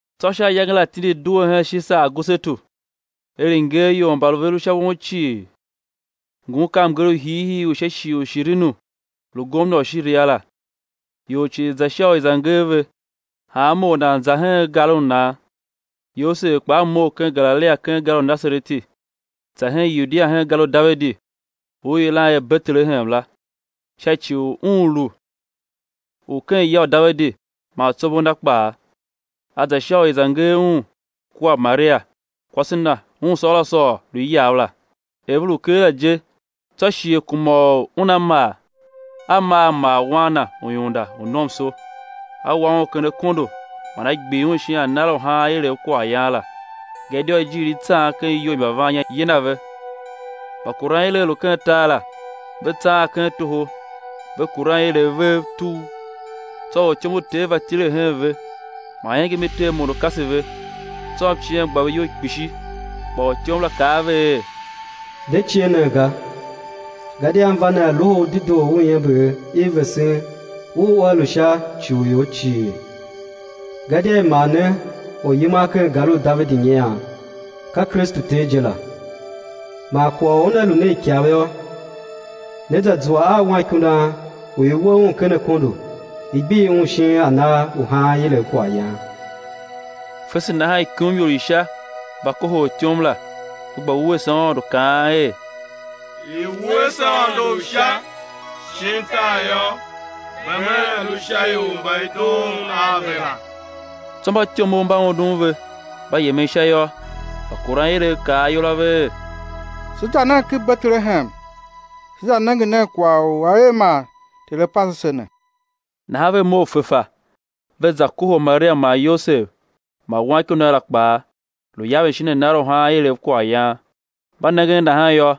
Tsô sha ayange la tindi due hen Shisar Agusetu er i̱ nger ior mba ve lu sha won cii. Ngun ka mnger u hiihii u sha shighe u Shiriniu lu gomna u Shiria la. Ior cii za sha u i̱ za nger ve, hanma or nan za hen gar u nan. Yosev kpaa mough ken Galilia ken gar u Nasareti, za hen Yudia hen gar u Davidi u i yilan er Betelehem la, sha ci u un lu u ken ya u Davidi man tsombor na kpaa. A za sha u i̱ za nger un, kua Maria, kwase na u un sôôr a sôôr, lu iyav la. Er ve lu keela je, tsô shighe kuma u una mar; a maa a mar Wan na u iunda u nomso, a wa Un ken akondo man a gbir Un shin anar u haan ilev kwaghyan la, gadia ijiir i tsan ken iyou i mbavannya yina ve. Mbakuranilev lu ken tar la, ve tsaan ken toho, ve kuran ilev vev tugh. Tsô ortyom u Ter va tile hen ve, man iengem i Ter mondo kase ve, tsô mciem gba ve iyol kpishi. Kpa ortyom la kaa a ve er: De cie nen ga, gadia m va ne a loho u dedoo u iember i vesen u ua lu sha ci u ior cii; gadia i mar ne Oryiman ken gar u Davidi nyian, ka Kristu Ter je la. Man kwagh u una lu ne ikav yô, né za zua a Wanikundan u i we Un ken akondo i gbir Un shin anar u haan ilev kwaghyan. Fese nahan ikumior i Sha va kohol ortyom la, ve gba wuese Aôndo, kaan er: I̱ wuese Aôndo Sha, shin tar yô, bem a̱ lu sha ior mba i doon Un a ve la. Tsô mbatyomov mba undun ve, mba yemen Sha yô, mbakuranilev kaa ayol a ve er: Se za nen ken Betelehem, se za nenge nen kwagh u a er man Ter A pase se ne. Nahan ve mough fefa, ve za kohol Maria man Yosev, man Wanikundan la kpaa, lu yaven shin anar u haan ilev kwaghyan. Mba nengen nahan yô,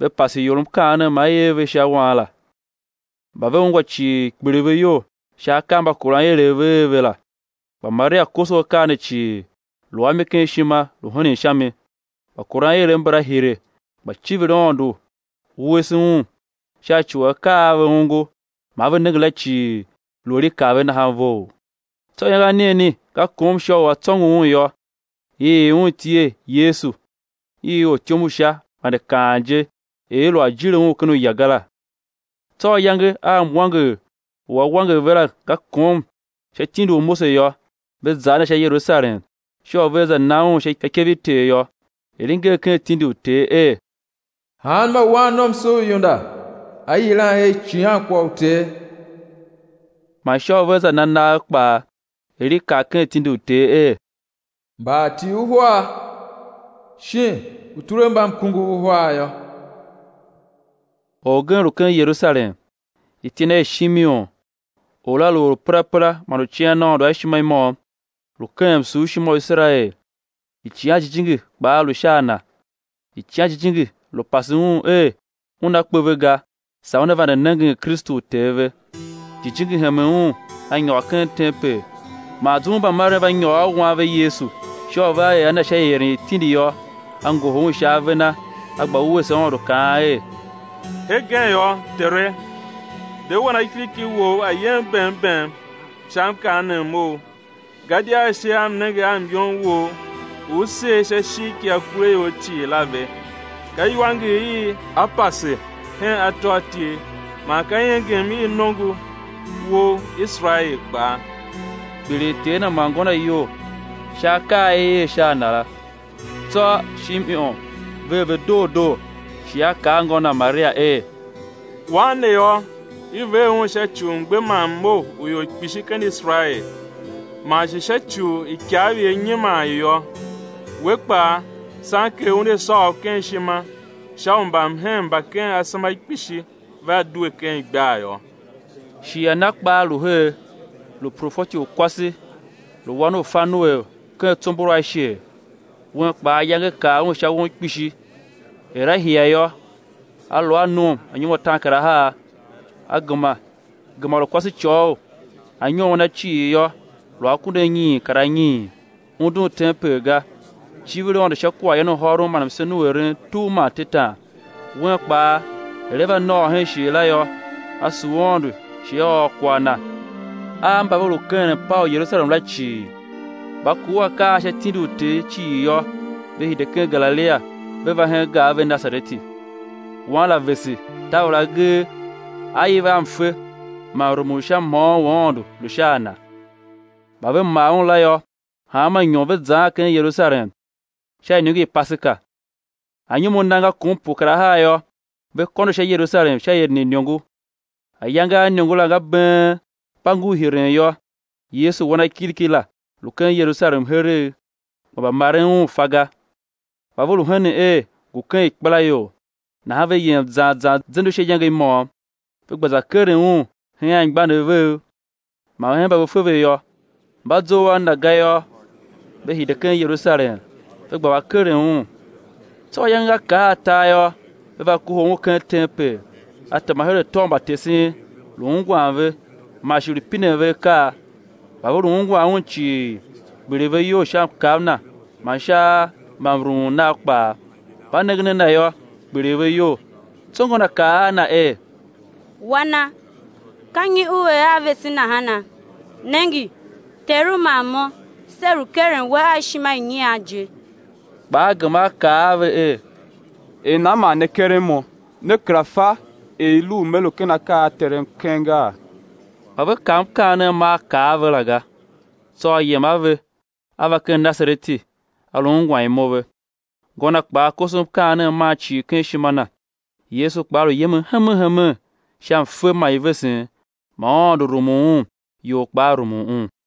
ve pase ior mkaanem ma i er ve sha Wan la. Mba ve ungwa cii, kpiligh ve iyol sha akaa a mbakuranilev ve er ve la. Kpa Maria koso akaa ne cii, lu a mi ken ishima lu henen sha mi. Mbakuranilev mbala hire, gba civir Aôndo, wuese Un, sha ci u akaa a ve ongo man ve nenge la cii lu er i kaa ve nahan vough. Tsô ayange anigheni nga kom sha u á tsôngo Un yô, i ii Un iti er Yesu, i ortyom u Sha vande kaan je, er i lu a jile Un ken uya ga la. Tsô ayange a mwanger u á wanger ve la nga kom sha tindi u Mose yô, ve za a Na sha Yerusalem sha u vea za na Un sha ikev i Ter yô, er i nger ken tindi u Ter er: Hanma wannomso u iunda á yilan er icighankwagh u Ter, man sha u vea za na nagh kpaa, er i kaa ken tindi u Ter er, mbaatii uhar, shin utulembamkunguv uhar yô. Orgen lu ken Yerusalem, iti na er Shimeon; or la lu or u perapera man u cian Aôndo a ishima i môm, lu keghen msurshima u Iserael; Icighan Jijingi kpaa lu sha a na. Icighan Jijingi lu pase un er una kpe ve ga saa una vande nengen Kristu u Ter ve. Jijingi hemen un, a nyôr ken tempel man zum u mbamaren va nyôr a Wan ve Yesu sha u vea er a Na sha ieren i tindi yô, A ngohol Un sha ave na, a gba wuese Aôndo kaan er: Hegen yô, Tere, de wanakiriki Wou a̱ yem bem, bem sha mkaanem Ou; Gadia ashe am nenge a myom Wou u U ser sha ishigh ki akuraior cii la ve; ka iwanger i á pase i hen atôatyev, man ka iengem i nongo Wou Iserael kpaa. Kpiligh ter Na man ngô Na iyol sha akaa a i er sha a Na la. Tsô Shimeon ver ve doo doo, shi a kaa a ngô Na, Maria, er: Wan ne yô, i ver Un sha ci u mgbe man mmough u ior kpishi ken Iserael, man shi sha ci u ikav i á nyiman i yô (we kpaa, sanker una sôô u ken ishima), sha u mbamhen mba ken asema kpishi vea due ken igbar yô. Shi Ana kpaa lu her, lu profeti u kwase, lu wan u Fanuel u ken tsombor u Asher; un kpaa ayange kar un sha won kpishi, er a hia yô, a lu a nom anyom ataankarahar, gema lu kwasecôghol, anyom a na cii yô, lu akunduanyiin kar anyiin, undun tempel ga, civir Aôndo sha kwaghyan u hôron man msen u eren tugh man tetan. Un kpaa, er a va nôôr hen shighe la yô, a sugh Aôndo shi a ôr kwagh Na a mba ve lu keghen mpaa u Yerusalem la cii. Mba kur akaa a sha tindi u Ter cii yô, ve hide ken Galilia ve va hen gar ve Nasareti. Wan la vese, taver agee, A iv a mfe; man mrumun u sha mhôôn u Aôndo lu sha a Na. Mba ve mar Un la yô, hanma inyom ve zaan ken Yerusalem sha iniongo i Paseka. Anyom a Na nga kom pue kar ahar yô, ve kôndo sha Yerusalem sha ieren i iniongo. Ayange a iniongo la nga been, mba ngur hiren yô, Yesu Wanakiriki la, lu ken Yerusalem heregh, kpa mbamaren Un fa ga. Kpa ve lu henen er, ngu ken ikpelaior, nahan ve yem zan zan zende u sha iyange i môm, ve gba za keren Un hen anmgbianev vev man hen mba ve fe ve yô; mba zough a Na ga yô, ve hide ken Yerusalem, ve gba keren Un. Tsô ayange nga kar atar yô, ve va kohol Un ken tempel, A tema her atô u mbatesen, lu ungwan ve, man shi lu pinen ve akaa. Mba ve lu ungwan Un cii, kpiligh ve iyol sha mkav Na man sha mbamrumun Nav kpaa. Mba nengen a Na yô, kpiligh ve iyol; tsô ngô Na kaa a Na er: Wana, ka nyi U er a vese nahana? Nenge, teru man mo, se lu keren We a ishima i nyian je. Kpa A gema A kaa a ve er: Er nan man ne keren Mo? Ne kera fa er i lu u Me lu ken akaa a Terem keng gaa? Kpa ve kav mkaanem ma A kaa a ve la ga. Tsô A yem a ve, A va ken Nasareti, A lu ungwan imo ve. Ngô Na kpaa koso mkaanem man cii ken ishima na. Yesu kpaa lu yemen hemen hemen sha mfe man ivesen, man Aôndo rumun Un, ior kpaa rumun Un.